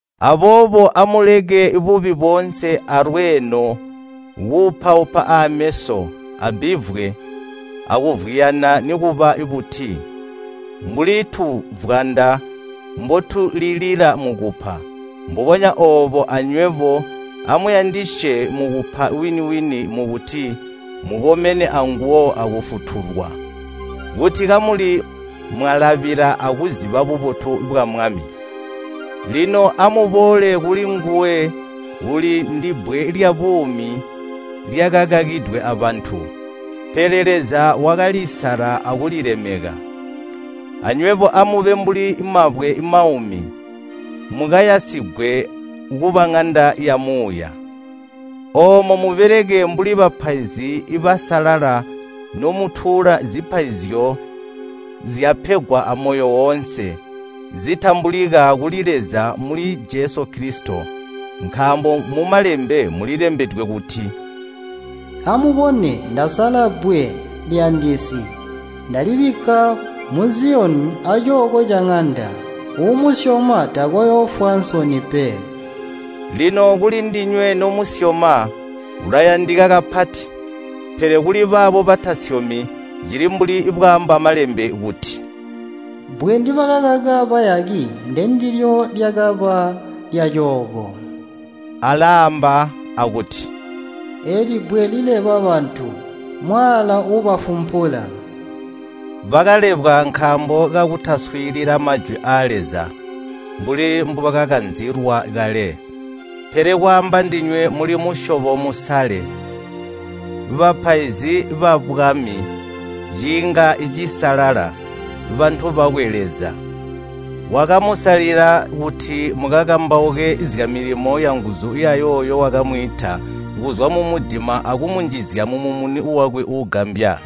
Aboobo amuleke bubi boonse alweeno, kuupaupa ameso, abbivwe, akuvwiyana nikuba buti. Mbuli tuvwanda mbotulilila mukupa, mbubonya oobo anywebo amuyandisye mukupa wini-wini mukuti mukomene anguwo akufutulwa, kuti kamuli mwalabila akuziba bubotu bwa Mwami. Lino amuboole kulinguwe uuli ndibbwe lyabuumi lyakakakidwe abantu, pele Leza wakalisala akulilemeka. Anywebo amube mbuli mabwe maumi, mukayasigwe kuba ŋanda yamuuya. Oomo mubeleke mbuli bapaizi basalala nomutuula zipaizyo zyapegwa amoyo woonse, zitambulika kuli Leza muli Jesu Kilisito. Nkaambo mu Malembe mulilembedwe kuti, “Amubone, ndasala bbwe liyandisi. Ndalibikka mu Ziyoni acooko caŋanda, uumusyoma takooyoofwa nsoni pe.” Lino kulindinywe nomusyoma, ulayandika kapati, pele kuli baabo batasyomi, cili mbuli bwaamba Malembe kuti, “Bbwe ndibakakaka bayaki ndendilyo lyakaba lyaacooko.” Alaamba akuti, “Eeli bbwe lileba bantu, mwaala uubafumpula.” Bakalebwa nkaambo kakutaswiilila Majwi aa Leza mbuli mbubakakanzilwa kale. Pele kwaamba ndinywe muli musyobo musale, bapaizi babwami, ciinga cisalala, bantu bakwe Leza. Wakamusalila kuti mukakambauke zyamilimo yanguzu yayooyo wakamwiita kuzwa mumudima akumunjizya mumumuni wakwe uugambya.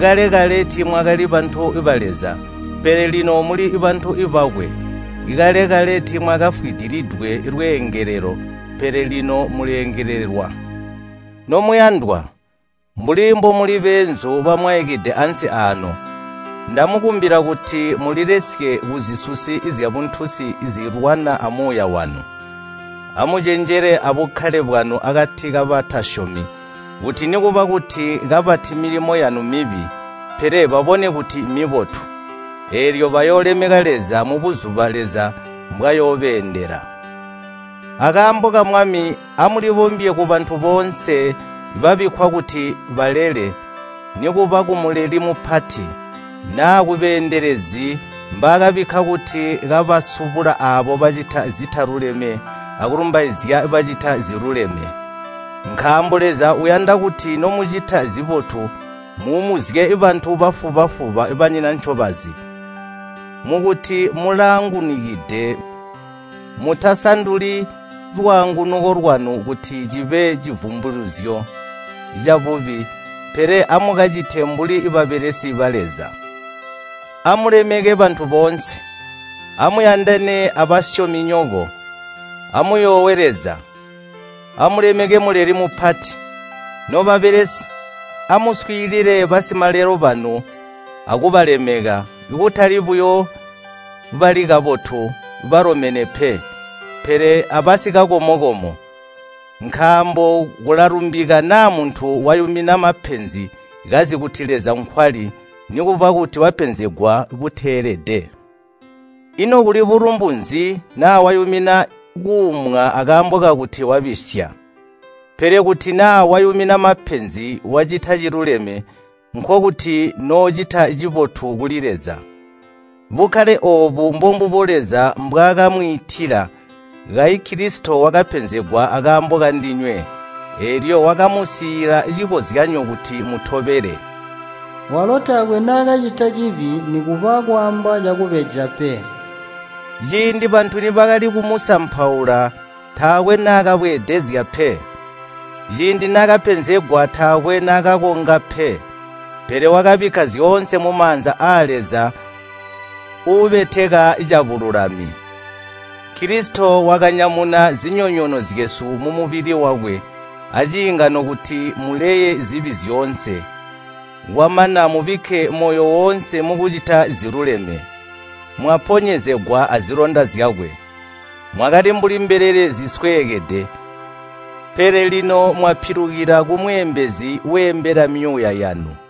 Kale-kale tiimwakali bantu ba Leza, pele lino muli bantu bakwe. Kale-kale tiimwakafwidilidwe lweengelelo, pele lino muleengelelwa. Nomuyandwa, mbuli mbomuli beenzu bamwaikide ansi aano, ndamukumbila kuti mulilesye kuzisusi zyabuntunsi zilwana amuuya wanu. Amucenjele abukkale bwanu akati kabatasyomi, kuti nikuba kuti kabati milimo yanu mmibi, pele babone kuti mmibotu. Eelyo bayoolemeka Leza mubuzuba Leza mbwayoobeendela. Akaambo ka Mwami, amulibombye kubantu boonse babikkwa kuti balele, nikuba kumuleli mupati, naa kubeendelezi mbaakabikka kuti kabasubula aabo bacita zitaluleme akulumbaizya bacita ziluleme. Nkaambo Leza uyanda kuti nomucita zibotu muumuzye bantu bafuba-fuba banyina ncobazi. Mukuti mulaangunukide, mutasanduli lwaangunuko lwanu kuti cibe civumbilizyo cabubi, pele amukacite mbuli babelesi ba Leza. Amulemeke bantu boonse. Amuyandane abasyominyoko. Amuyoowe Leza. Amulemeke muleli mupati. Nobabelesi, amuswiilile basimalelo banu akubalemeka, kutali buyo bali kabotu, balomene pe, pele abasikakomo-komo. Nkaambo kulalumbika naa muntu wayumina mapenzi kazi kuti Leza nkwali, nikuba kuti wapenzegwa buteelede. Ino kuli bulumbu nzi naa wayumina kuumwa akaambo kakuti wabisya? Pele kuti naa wayumina mapenzi wacita ciluleme, nkokuti noocita cibotu kuli Leza. Bukkale oobu mbombubo Leza mbwaakamwiitila. Kayi Kilisito wakapenzegwa akaambo kandinywe, eelyo wakamusiila cikozyanyo kuti mutobele. Walo taakwe naakacita cibi nikuba kwaamba cakubeja pe. Ciindi bantu nibakali kumusampaula, taakwe naakabweedezya pe. Ciindi naakapenzegwa taakwe naakakonga pe. Pele wakabikka zyoonse mumaanza aa Leza uubeteka cabululami. Kilisito wakanyamuna zinyonyoono zyesu mumubili wakwe aciingano kuti muleye zibi zyoonse, pele mubikke moyo woonse mukucita ziluleme. Mwaponyezegwa azilonda zyakwe. Mwakali mbuli mbelele zisweekede, pele lino mwapilukila kumweembezi weembela myuuya yanu.